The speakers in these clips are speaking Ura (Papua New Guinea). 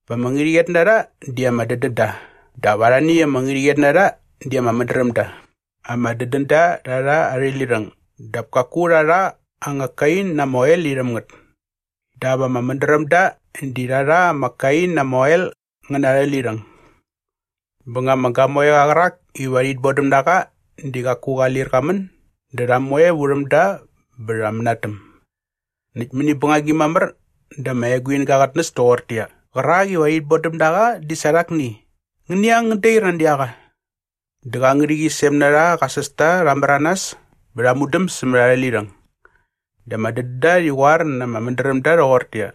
Ama ngärhäqyet na rha di ama dädän da dap arhani ama ngärhäqyet na rha di ama mädräm da. Ama dädända rha rha arhä lirhäng dap kaku rha rha anga kain na ama oel irhäm ngät. Dap ama mädrämda di rha rha ama kain na ama oel ngä na arhä lirhäng. “Bä nga ama gamoeqa qärak iva rhit bodäm na qa di qaku qa lir qa män dä rha moe vurhäm da bä rha mänatäm. Näkt mäni bängagi mamär dä ama eguinga qät näs toqortäqyia, ‘Qärak iva rhit bodäm na qa di sa rhakni! Ngäni ang ngän dair nani a qa.’ “Dä qa ngärhäqyisem na rha qa sästa rha märanas bä rha mudam sämät arhä lirhäng. Dä ama dädända rhi qoar na ama mädrämda rhoqortäqyia,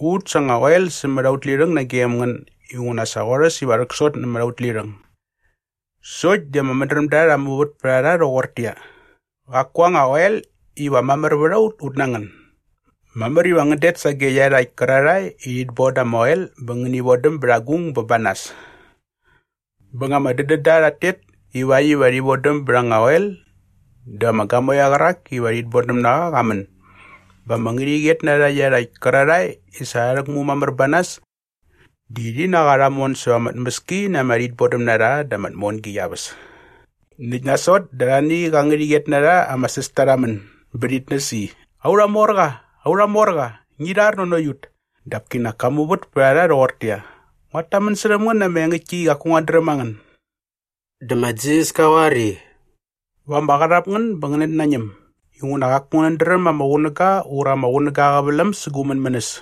‘Ut sa anga oel sämät aut lirhäng nagem ngän inguna sa qorhäs iva rhäksot nämät aut lirhäng.’ “Sokt di ama mädrämda rha muvät pät a rha rhoqortäqyia, ‘Qaku anga oel iva mamär vät a ut ut na ngän. Mamär iva ngän det sage iarhakt kärarhae i rhit boda ama oel bä ngäni vodäm bät agung bä ba nas.’ “Bä nga ama dädända rhat tet ivakt iva rhi vodäm bät anga oel dä ama gamoeqa qärak iva rhit bodäm na qa qa män bä ama ngärhäqyet na rha iarhakt kärarhae i sa rha rhäkmu mamär ba nas di rhi na qa rha mon säva ama tmäski na ama rhitbodämnarha dä ama tmongi qia väs. Näkt nasot dä arhani qa ngärhäqyet na rha ama sästa rha män bä rhit näs i, ‘Aurha morqa, aurha morqa, ngi rhar nanokt ut!’ “Dap kinak ka muvät pät a rha rhoqortäqyia, ‘Nguat tamän särhäm ngän na ama engäktki i qaku nguat dräm a ngän.’” Dä ma Jisas ka qoar i, “Va ama qarhap ngän bä ngänät nañäm inguna qaku ngänät dräm ama qunäga ura ama qunäga aa qäväläm sä gu mänmänäs.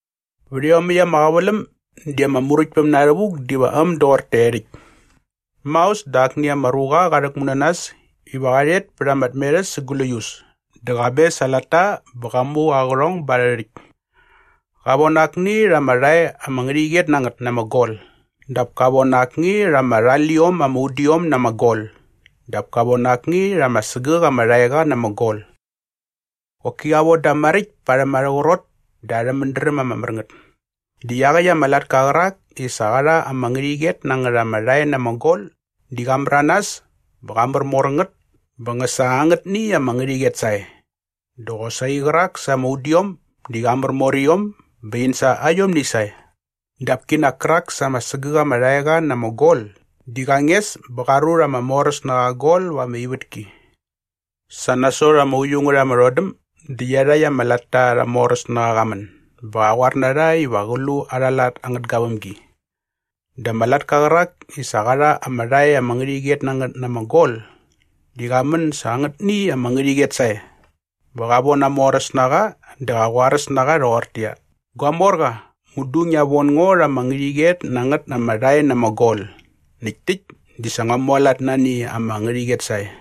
“Vät iomäkt ama qäväläm di ama Muräktpäm na rhävuk diva äm doqor taerhäkt. Maos dä akni ama ruqa qa rhäkmu na nas iva qa rhet pät ama tmerhäs sa gläius dä qa mes aa latta bä qa mu aa qärhong ba arhä rhäkt. Qa von akni rha ama rhae ama ngärhäqyet na ngät na ama gol dap ka von akni rha ama rhaliom ama udiom na ama gol dap ka von akni rha ama sägäk ama rhaeqa na ama gol. Qoki qa von da maräkt parhäm arhä qrot dä arhä mädräm ama mär ngät. “Dä iaqäkt ama latka qärak i sa qa rha ama ngärhäqyet na ngät ama rhae na ama gol di qa märanas bä qa märmor ngät bä ngä sa angätni ama ngärhäqyet sae. Dä qosaqi qärak sa ama udiom di qa märmor iom bä in sa aiom sae. Dap kinak kärak sa ama sägäk ama rhaeqa na ama gol di qa nges bä qa rut aa moräsnaqa aa gol va ama ivätki. “Sa nasot ama uiu ngät ama rhodäm dä iarhakt ama latta arha moräsnaqa qa män bä qa qoar na rha iva qä lu arha lat angät gavämgi. Dä ama latka qärak i sa qa rha ama rhae ama ngärhäqyet na ngät na ama gol di qa män sa angätni ama ngärhäqyet sae bä qa von aa moräsnaqa dä qa qoaräs na qa rhoqortäqyia, ‘Gua morqa, mudu ngia von ngo rha ama ngärhäqyet na ngät ama rhae na ama gol näkt täkt di sa ngua mualat nani ama ngärhäqyet sae.’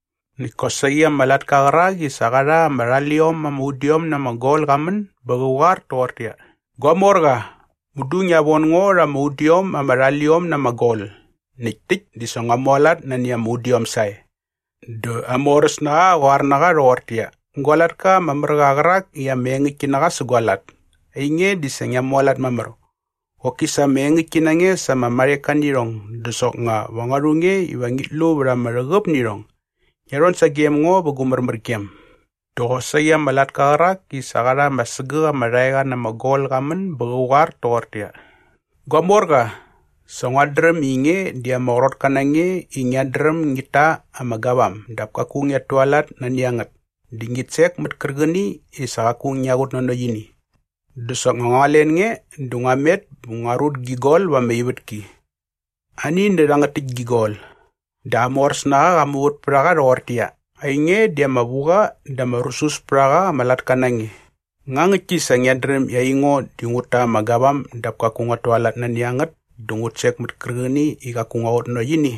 “Näkt kosaqi ama latka qärak i sa qa rha ama rhaliom ama udiom na ama gol qa män bä qä qoar toqortäqyia, ‘Gua morqa, mudu ngia von ngo rha ama udiom ama rhaliom na ama gol näkt täkt di sa ngua mualat nani ama udiom sae.’ “Dä aa moräsnaqa qa qoar na qa rhoqortäqyia, ‘Gua latka ama mär qa qärak i ama engäktki na qa sä gua lat, ainge di sa ngia mualat mamär. Qoki sa ama engäktki na nge sa ama marheka nä irhong dä soknga va ngua rhu nge iva ngit lu vät ama rhäqäp nä irhong. Ngia rhon sagem ngo vä gu märmärgem.’ “Dä qosaqi ama latka qärak i sa qa rha ama sägäk ama rhaeqa na ama gol qa män bä qä qoar toqortäqyia, ‘Gua morqa, sa nguat dräm i nge di ama qrotka na nge i ngiat dräm ngit ta ama gavam dap kaku ngiat tualat nani a ngät dä ngit sek mät kärqäni i sa qaku ngia qutnanokt ini. Dä soknga ngua len nge dä ngua met bä ngua rut gi gol va ama ivätki. Ani nä rhangät täkt gi gol.’ “Dä aa moräsnaqa qa muvät pät a qa rhoqortäqyia, ‘Ainge di ama vu qa dä ama rusus pät a qa ama latka na nge. Nga ngäktki sa ngiat dräm i aingo di ngut ta ama gavam dap kaku nguat tualat nani a ngät dä ngut sek mät kärqäni i qaku ngua qutnanokt ini?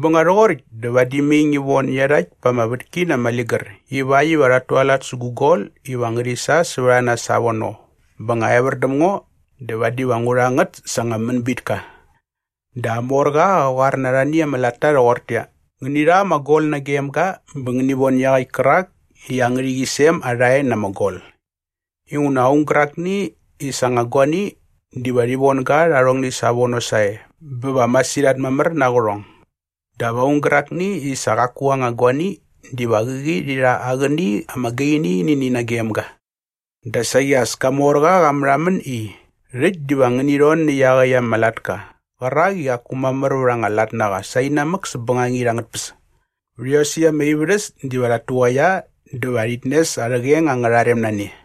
Bä nga rhoqoräkt dä vadi mai ngi von iarhakt pa ama vätki na ama ligär ivakt iva rhat tualat sä gu gol iva ngärhi sa sävät a nas savono bä nga evär däm ngo dä vadi va ngu rha ngät sa anga mänbitka.’ “Dä aa morqa qa qoar na arhani ama latta rhoqortäqyia, ‘Ngäni rha ama gol nagem ga bä ngäni von iaqäkt kärak i aa ngärhäqyisem aa rhae na ama gol inguna aung gärakni i sa aa anga guani diva rhi von ga rha arhongni savono sae bä va masirhat mamär na aa qärhong. Dap aung gärakni i sa qaku aa anga guani diva qäqi rhi rha aa qäni ama gaini nä ini nagem ga.’ Dä saqi as ka morqa qa märhamän i, ‘Rhäkt diva ngäni rhon nä iaqäkt ama latka qärak i qaku mamär vät anga lat na qa sainamäk säp bängangit angät tpäs. Vät iosäkt ama ivärhäs diva rhat tuqaia dä va rhit nes arhä qeng angärha rem na ne.’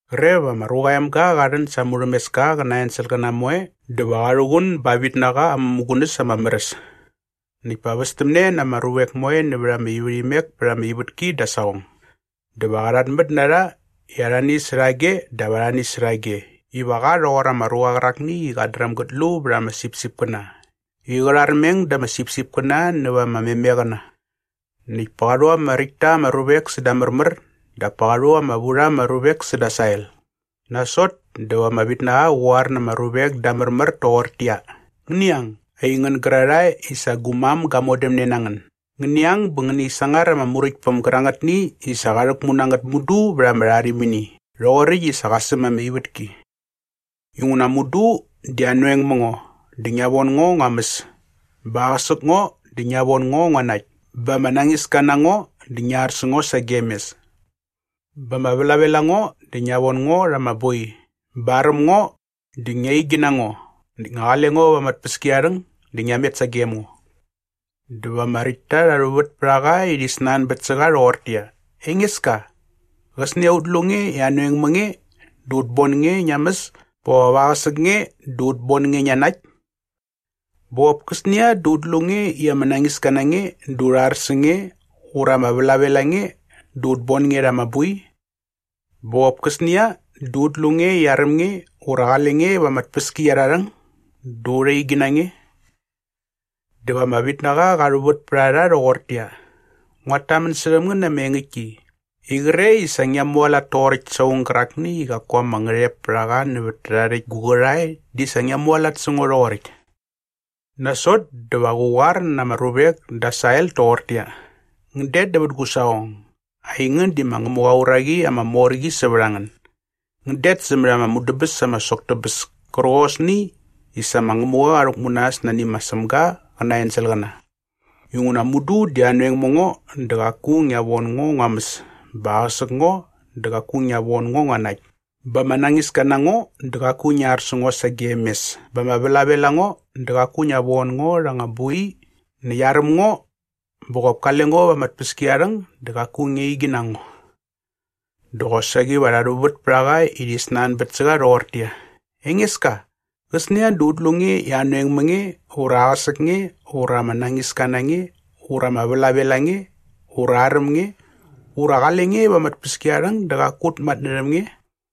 “Qre va ma Ruqa aa Emga qa rhän sa aa murhämeska qä na aa enselqäna moe dä va qa rhuqun ba aa vitnaqa aa mämugunäs ama mär äs. Näkt pa västämne na ama ruvek moe nävät ama ivärhimek pät ama ivätki da aa saqong. Dä va qa rhatmät na rha i arhani särhage dap arhani särhage iva qa rhoqor ama ruqa qärakni i qat dräm gät lu vät ama sipsipkäna i qä rharmeng da ama sipsipkäna näva ama memeqäna. “Näkt pa qa rhu ama räkt ta ama ruvek säda aa märmär dap pa qa rhu ama vu rha ama ruvek säda aa sael. Nasot dä va ama vitnaqa qä qoar na ama ruvek da aa märmär toqortäqyia, ‘Ngäni ang, aingän gärarhae i sa gu mam ga modämne na ngän. Ngäni ang bä ngäni sangar ama Muräktpäm gärangätni i sa qa rhäkmu na ngät mudu vät ama rharimini rhoqoräkt i qa säm ama ivätki. Inguna mudu di anoeng ma ngo dä ngia von ngo ngua mäs bä aqäsäk ngo dä ngia von ngo ngua nakt bä ama nañiska na ngo dä ngia ar sä ngo sagem mes bä ama vlavel a ngo dä ngia von ngo rha ama boi bä aräm ngo dä ngia igi na ngo näkt nga qale ngo va ama tpäskiarharhäng dä ngia met sagem ngo.’ “Dä va ama räktta rha rhuvät pät a qa i rhi snanbät sä qa rhoqortäqyia, ‘Engeska, qäsnia dä ut lu nge i anoeng ma nge dä ut bon nge ngia mäs bä qop aqäsäk nge dä ut bon nge ngia nakt? Bä qop käsnia dä ut lu nge i ama nañiska na nge dä urha ar sä nge ura ama vlavel a nge dä ut bon nge rha ama boi? Bä qop käsnia dä ut lu nge i aräm nge ura qale nge va ama tpäskiarharhäng dä urha igi na nge?’ “Dä va ama vitnaqa qa rhuvät pät a rha rhoqortäqyia, ‘Nguat tamän särhäm ngän na ama engäktki i qre i sa ngia mualat toqoräkt sa aung gärakni i qaku ama ngärhep pät a qa nävät tärhae rhäkt gu qärhae di sa ngia mualat sä ngo rhoqoräkt.’ “Nasot dä va qä qoar na ama ruvek da aa sael toqortäqyia, ‘Ngän det nävät gu saqong. Aingän di ma Ngämuqa aa uraqi ama mor qi sävät a ngän. Ngän det sämät ama mudäbäs ama sok tä bäs kärqosni i sa ma Ngämuqa qa rhäkmu na äs nani ma Sämga qä na aa enselqäna. Inguna mudu di anoeng ma ngo dä qaku ngia von ngo ngua mäs bä aqäsäk ngo dä qaku ngia von ngo ngua nakt bä ama nañiska na ngo dä qaku ngia ar sä ngo sagem mes bä ama vlavel a ngo dä qaku ngia von ngo rha anga boi näkt aräm ngo bä qop kale ngo va ama tpäskiarharhäng dä qaku ngia igi na ngo.’ “Dä qosaqi va rha rhuvät pät a qa i rhi snanbät sä qa rhoqortäqyia, ‘Engeska, qäsnia dä ut lu nge i anoeng ma nge ura aqäsäk nge ura ama nañiska na nge ura ama vlavel a nge ura aräm nge ura qale nge va ama tpäskiarharhäng dä qaku ut matnärhäm nge?’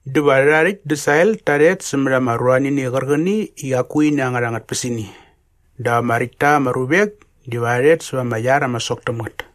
“Dä va rhärhae rhäkt da aa sael ta rhet sämät ama ruanini qärqäni i qaku ini angärha anga tpäsini. Dap ama räkt ta ama ruvek diva rha rhet säva ama iar ama sok täm ngät.”